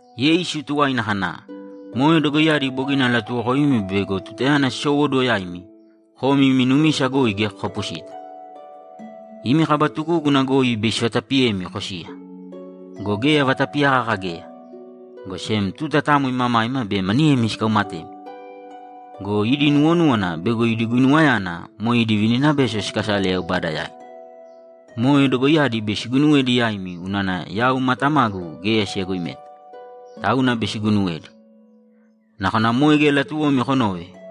Yeisu tuwaina kana, ‘Moe dogoiyadi bogina alatuwokoimi bego tutayana sisowóduwo yaimi, komi imi numisa goi geya kokapusita. Imi kaba tugúguna goi bei sivatapiyemi kosiya. Go geya vatapiya kaka geya, go sem tuta tamo imamaima be maniyemi sikaumatemi go, idi nuwonúwana bego idi guinuwayana moe idi vininabeso sikasale Yaubada yaina. Moe dogoiyadi bei siguinuwedi yaimi unana yau ma Tamagu geya siyagoimeta, tauna bei siguinuwedi. Nakona moe geya latuwomi konove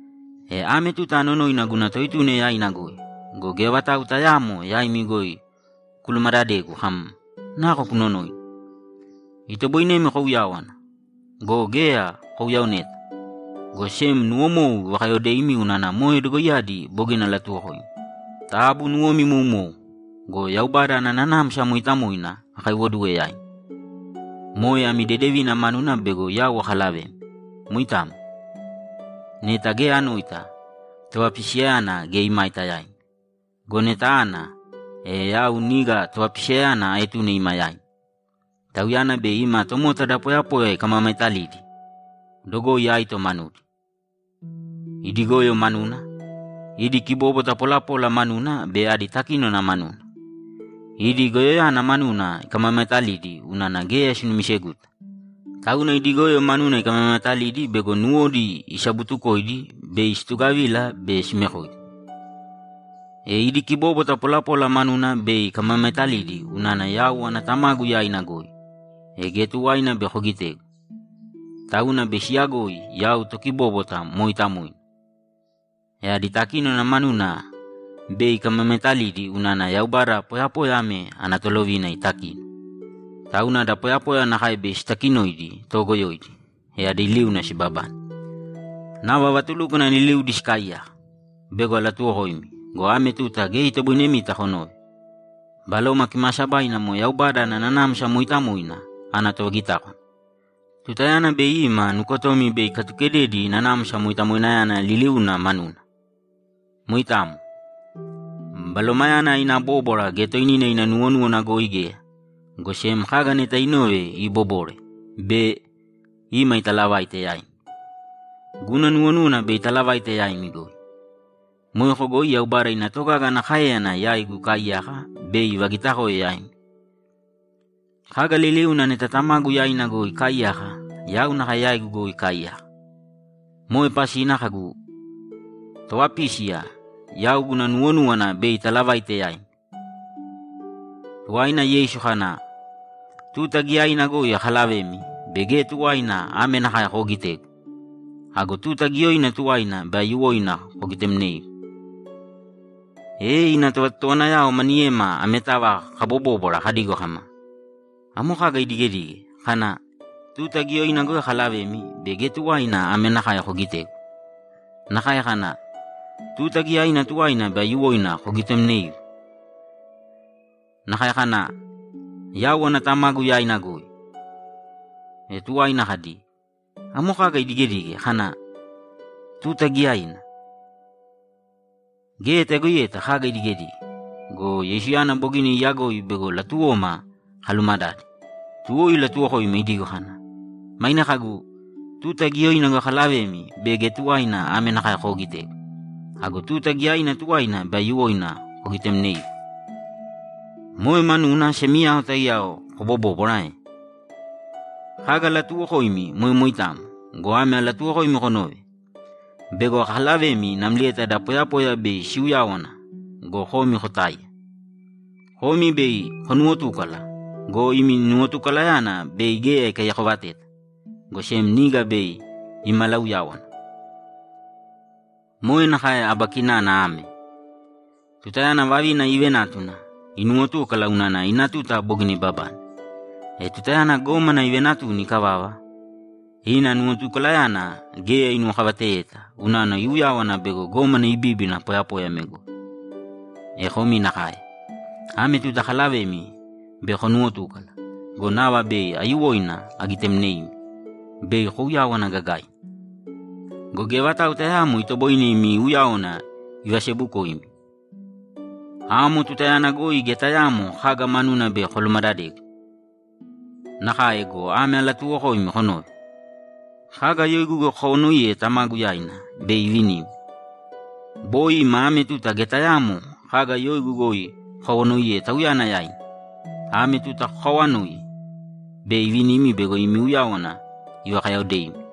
E ame tuta anonoina guna Toetuna yaina goi go, geya vatau tayaamo yaimi goi kulumadadegu kam, “Nako kunonoina?” Itoboinemi kouyáwana go, geya kouyaoneta, go sem nuwomou ivakayaodeimi unana moe dogoiyadi bogina alatuwokoimi. Taabu nuwomi imoumōu. Go Yaubada ana Nanamsa Mooitamoina akaiwoduwe yaimi. Moe ami dedevina manuna bego yau akalavemi. Moitamo. Neta geya anoita, Tovapisiyayana geya imaita yaimi. Go neta ana, e yau niga Tovapisiyayana aetune ima yaimi. Tauyana bei ima tomota da poyapoya ikamamaetalidi dogoi aito manudi: Idi goyo manuna, idi kibobwata polapola manuna be adi takínona manuna. Idi goyoyana manuna ikamamaetalidi unana geya sinumiseguta. Tauna idi goyo manuna ikamamaetalidi bego nuwodi isabutukoidi bei situgavila be simekoigu. E idi kibobwata polapola manuna bei ikamamaetalidi unana yau ana Tamagu yaina goi, e geya tuwaina bei kogitegu, tauna bei siyagoi yau tokibóbwata mooitamoina. E adi takinona manuna bei ikamamaetalidi unana Yaubada poyapoya ame ana tolovina itakino, tauna da poyapoya nakae bei itakinoidi toogoyoidi, e adi liuna sibabane. Nava vatulúkwana liliudi sikaaiyaka; bego alatuwokoimi go, ame tuta geya itoboinemita konove. Baloma Kimaasabaina moe Yaubada ana Nanamsa Mooitamoina ana tovagitákwana. Tutayana bei ima nukotomi bei ikatukededi Nanamsa Moitamoinayana liliuna manuna. Moitamo. Balomayana ina bóbwara geya toinina ina nuwonúwana goi geya, go sem kaga neta inove iibobore be ima italavaite yaimi. Guna nuwonúwana bei italavaite yaimi goi. Moeko goi Yaubada ina togaga ana káeyana yaigu ikaaiyaka bei ivagitakoe yaimi. Kaga liliuna neta Tamagu yaina ikaaiyaka, yau nakae yaigu goi ikaaiyaka. Moe pasina kagu, “Tovapísiya yau guna nuwonúwana bei italavaite yaimi.”’ Tuwaina Yeisu kana, ‘Tuta giyaina goi akalavemi be geya tuwaina ame nakae koogitegu. Ago tuta giyaina tuwaina bei aiyuwoina kogitemneigu.’ E ina tovatotowanayao maniyema ametava kabobóbwara kadigo kama, ‘Amo kaga idigedige, kana, “Tuta giyaina goi akalavemi be geya tuwaina ame nakae kogitegu”? Nakae kana, “Tuta giyaina tuwaina bei aiyuwoina kogitemneigu”? Nakae kana, “Yau ana Tamagu yaina goi”?’ E tuwaina kadi, ‘Amo kaga idigedige kana, “Tuta giyaina”? Geya tayagoiyeta kaga idigedige.’ Go Yeisuyana bogina iyagoi bego latuwoma kalumadade, tuwo ilatuwokoima idigo kana, ‘Maine kagu, “Tuta giyaina goi akalavemi be geya tuwaina ame nakae koogitegu. Ago tuta giyaina tuwaina bei aiyuwoina kogitemneigu.” Moe manuna semiyao taiyao kobobóbwara ae? Kaga alatuuwokoimi moe moitamo go, ame alatuuwokoimi konōve: Bei akalavemi namlieta da poyapoya bei siuyáwana go, komi kotáiya. Komi bei konuwotúkala go, imi nuwotukalayana bei geya ikaiyakovateta, go sem niga bei imalauyáwana. Moe nakae aba kinana ame: Tutayana vavina iivenátuna, inuwotúkala unana ina tuta bogina ibabane. E tutayana gómana ivenatuni ikavava, ina nuwotukalayana geya inuwokavateyeta unana iuyáwana bego gómana ibíbina poyapoya ame goi. E komi nakae. Ame tuta akalavemi be konuwotúkala go, nava bei aiyuwoina agitemneimi, bei kouyáwana gagaina. Go geya vatau tayaamo itoboine imi uyáwana ivasebukoimi. Amo tutayana goi geya tayaamo kaga manuna bei kolumadadegu. Nakae go, ame alatuuwokoimi konōve: Kaga yoigu goi kokawanoiye Tamagu yaina, bei ivinimi. Boi ima ame tuta geya tayaamo kaga yoigu goi kokawanoiye Tauyana yaina. Ame tuta kokaawanōi, bei ivinimi bego imi uyáwana ivakayaodeimi.’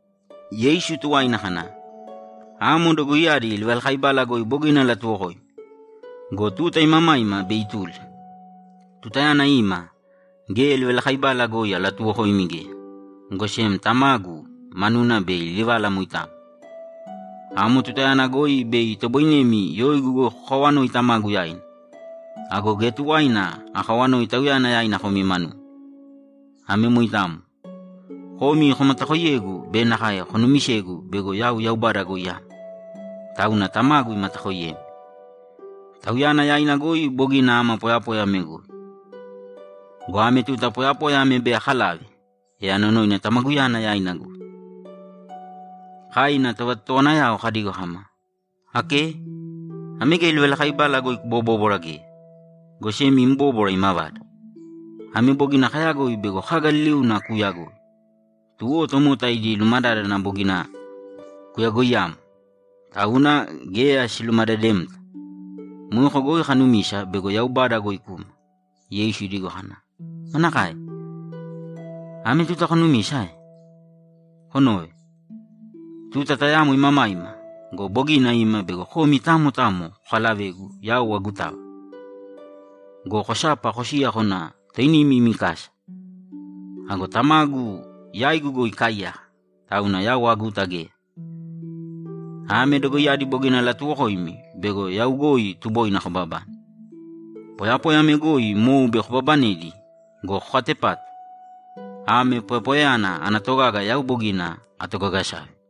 Yeisu tuwaina kana, ‘Amo dogoiyadi livalakaibala goi bogina alatuwokoimi. Go tuta imamaima bei ituli. Tutayana ima, geya livalakaibala goi alatuwokoimi geya, go sem Tamagu manuna bei alivala moitamo. Amo tutayana goi bei itoboinemi yoigu goi kokawanoi Tamagu yaina. Ago geya tuwaina akawanoi Tauyana yaina komi manumi. Ame moitamo. Komi komatakoiyegu be nakae konumisegu bego yau Yaubada goi ama, tauna Tamagu imatakoiyemi. Tauyana yaina goi bogina ama poyapoya ame goi. Go ame tuta poyapoya ame bei akalave, e anonoina Tamaguyana yaina goi.’ Kai ina tovatotowanayao kadigo kama, ‘Ake, ame geya livalakaibala goi kubobóbwara geya, go sem im bóbwara imavada. Ame bogina kayagoi bego kaga liliuna kuuyagoi, tuwo tomota idi lumadádana bogina kuyagoiyamo, tauna geya silumadademta. Moeko goi kanumisa bego Yaubada goi kuma.’ Yeisu idigo kana, ‘Manakae? Ame tuta konumisa ae? Konōve. Tuta tayamo imamaima go, bogina ima bego komi tamo tamo kokalavegu yau agutava go, kosapa kosiya kona toinimi imi kasa. Ago Tamagu yaigu goi ikaaiyaka, tauna yau aguta geya. Ame dogoiyadi bogina alatuwokoimi bego yau goi tuboina kobabane. Poyapoya ame goi mou bei kobabanedi go, kokatepātu! Ame poyapoyayana ana togaga yau bogina atogagasave.’